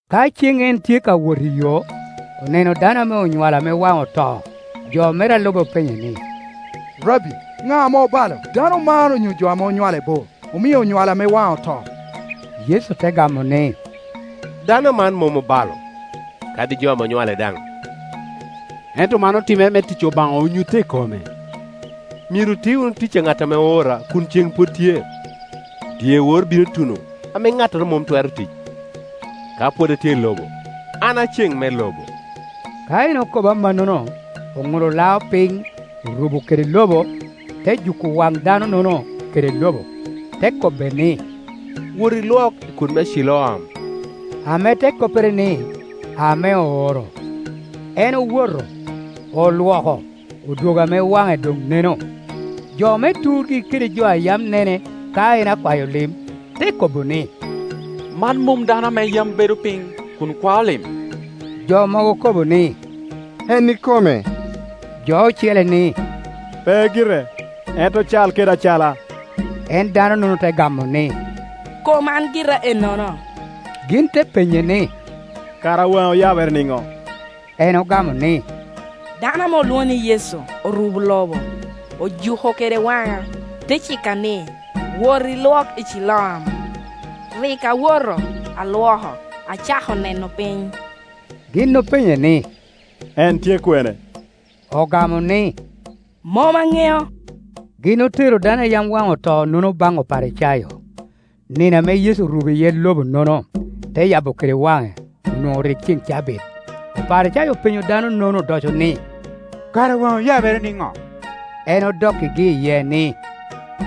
Ka cen en tye ka wot iyo, oneno dano ame onywalo ame waŋe oto. Jo mere a lube openye ni, “Rabbi, na ame obalo, dano man on yo jo ame onywale bo, omio onywale ame waŋe oto?” Yecu te gamo ni, “Dano man mom obalo, kadi jo ame onywale daŋ, ento man otimere me tic Obaŋa onyutte i kome. Myero oti wunu tic a ŋat ame oora kun cen pwod tye; dyewor bino tuno ame ŋattoro mom twero tic. Ka pwod atye i lobo, an a ceŋ me lobo.” Ka en okobo amannono, oŋulo lao piny, orubo kede lobo, te juko wan dano-nono kede lobo, te kobbe ni, “Woti, ilwok i kut me Ciloam” (ame te koppere ni, Ame ooro). En owoto, olwoko, odwogo ame waŋe doŋ neno. Jo me turgi kede jo a yam ne ne ka en akwayo lim te kobo ni, “Man mom dano ame yam bedo piny kun kwao lim?” Jo mogo okobo ni, “En ikome”; jo ocele ni, “Pe gire, ento cal kede acala.” En dano-nono te gamo ni, “Kom an gira ennono.” Gin te penye ni, “Kara waŋi oyabere nino?” En ogamo ni, “Dano ame olwoŋo ni Yecu orubo lobo, ojuko kede waŋa, te cika ni, ‘Woti, ilwok i Ciloam.’ Rik awoto, alwoko, acako neno piny.” Gin openye ni, “En tye kwene?” Ogamo ni, “Mom aŋeo.” Gin otero dano a yam waŋe otonono baŋ Oparicayo. Nino ame Yecu orubo iye lobo-nono, te yabo kede waŋe, onwoŋo rik ceŋ me cabit. Oparicayo openyo dano-nono odoco ni, “Kara waŋi oyabere niŋo?” En odokkigi iye ni,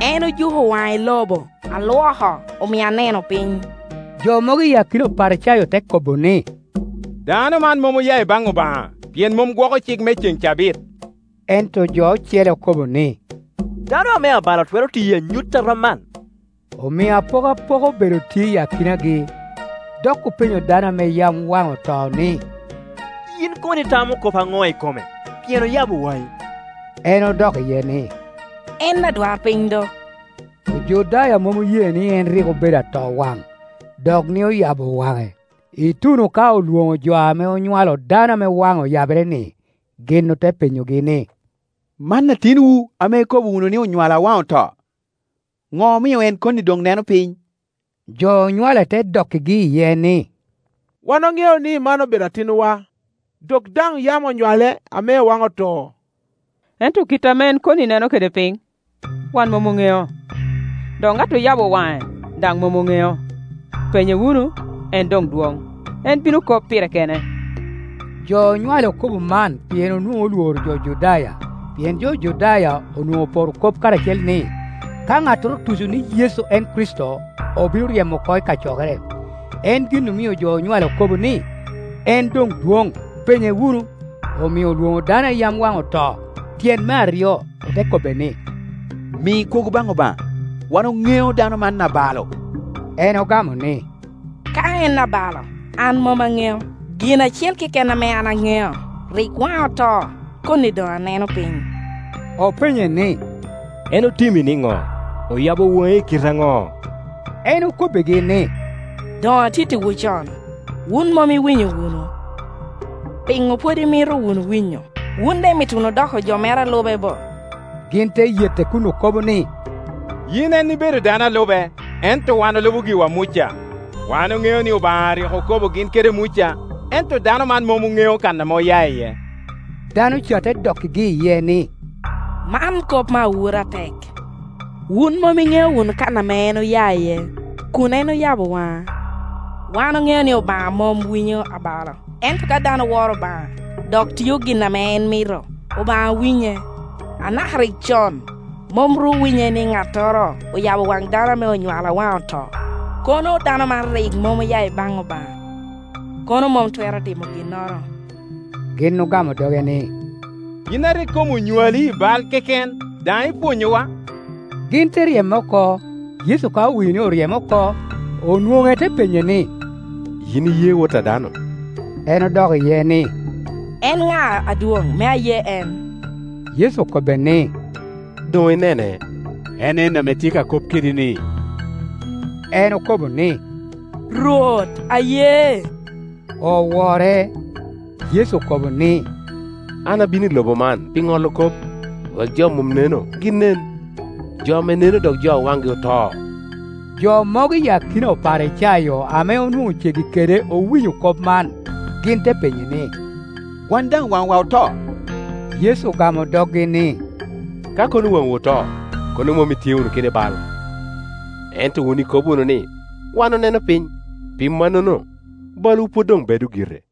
“En ojuko waŋa i lobo, alwoko, omia aneno piny.” Jo mogo i akina Oparicayo te kobo ni, “Dano man mom oya ibaŋ Obaŋa, pien mom gwoko cik me cen cabit.” Ento jo ocele okobo ni, “Dano ame abalo twero tiyo anyut a rom man?” Omio apokapoka obedo tye i akinagi. Dok openyo dano ame yam waŋe oto ni, “Yin kono itamo kop aŋo i kome, pien oyabo waŋi?” En odok iye ni, “En adwarpiny do.” Ojudaya mom oye ni en rik obedo atowaŋ, dok ni oyabo waŋe, ituno ka olwoŋo jo ame onywalo dano ame waŋe oyabere-ni. Gin ote penyogi ni, “Man atinwu ame ikobo wunu ni onywalo a waŋe oto? Do omio en koni doŋ neno piny?” Jo onywale te dokkigi iye ni, “Wan oŋeo ni man obedo atinwa, dok daŋ yam onywale ame waŋe oto; ento kite ame en koni neno kede piny, wan mom oŋeo, dok ŋat oyabo waŋe daŋ mom oŋeo. Penye wunu; en doŋ dwoŋ, en bino kop pire kene.” Jo onywale okobo man pien onwoŋo olworo jo Judaya, pien jo Judaya onwoŋo oporo kop karacel ni, ka ŋattoro otuco ni Yecu en Kricito, obino ryemo oko i kacokere. En gin omio jo onywale okobo ni, “En doŋ dwoŋ, penye wunu.” Omio olwoŋo dano a yam waŋe oto tyen me aryo, ote kobbe ni, “Mi kwogo baŋ Obaŋa; wan oŋeo dano man abalo.” En ogamo ni, “Ka en abalo, an mom aŋeo; gin acel keken ame an aŋeo, rik waŋa oto, koni doŋ aneno piny.” Openye ni, “En otimi niŋo? Oyabo waŋi i kite aŋo?” En okobbigi ni, “Doŋ atittiwu con, wun mom iwinyo wunu. Piŋo pwod imito wunu winyo? Wun daŋ imito wunu doko jo mere a lube bo?” Gin te yete kun okobo ni, “Yin en ibedo dano a lube, ento wan olubo giwa Muca. Wan oŋeo ni Obaŋa rik okobo gin kede Muca, ento dano man mom oŋeo kan ame oya iye.” Dano ca te dokkigi iye ni, “Man kop me awura atek! Wun mom iŋeo wunu kan ame en oya iye, kun en oyabo waŋa. Wan oŋeo ni Obaŋa mom winyo abalo, ento ka dano woro Obaŋa, dok tio gin ame en mito, Obaŋa winye. A naka rik con mom ru owinyere ni ŋattoro oyabo wan dano ame onywale a waŋe oto. Kono dano man rik mom oya i baŋ Obaŋa, kono mom twero ti mo ginnoro.” Gin ogamo doge ni, “Yin a rik kom onywali i bal keken, daŋ ipwonyowa?” Gin te ryeme oko. Yecu ka owinyo ni oryeme oko, onwoŋe te penye ni, “Yin iye Wot a dano?” En odok iye ni, “En na, adwoŋ, me aye en?” Yecu okobbe ni, “Doŋ inene; en en ame tye ka kop kedi-ni.” En okobo ni, “Rwot, aye”; owore. Yecu okobo ni, “An abino i lobo man pi ŋolo kop, wek jo a mom neno gin nen, jo ame neno dok jo a wangi oto.” Jo mogo i akina Oparicayo ame onwoŋo ceggi kede owinyo kop man. Gin te penye ni, “Wan daŋ waŋwa oto?” Yecu ogamo doggi ni, “Ka kono waŋwu oto, kono mom itye wunu kede bal; ento wun ikobo wunu ni, ‘Wan oneno piny’; pi mannono balwu pwod doŋ bedo gire.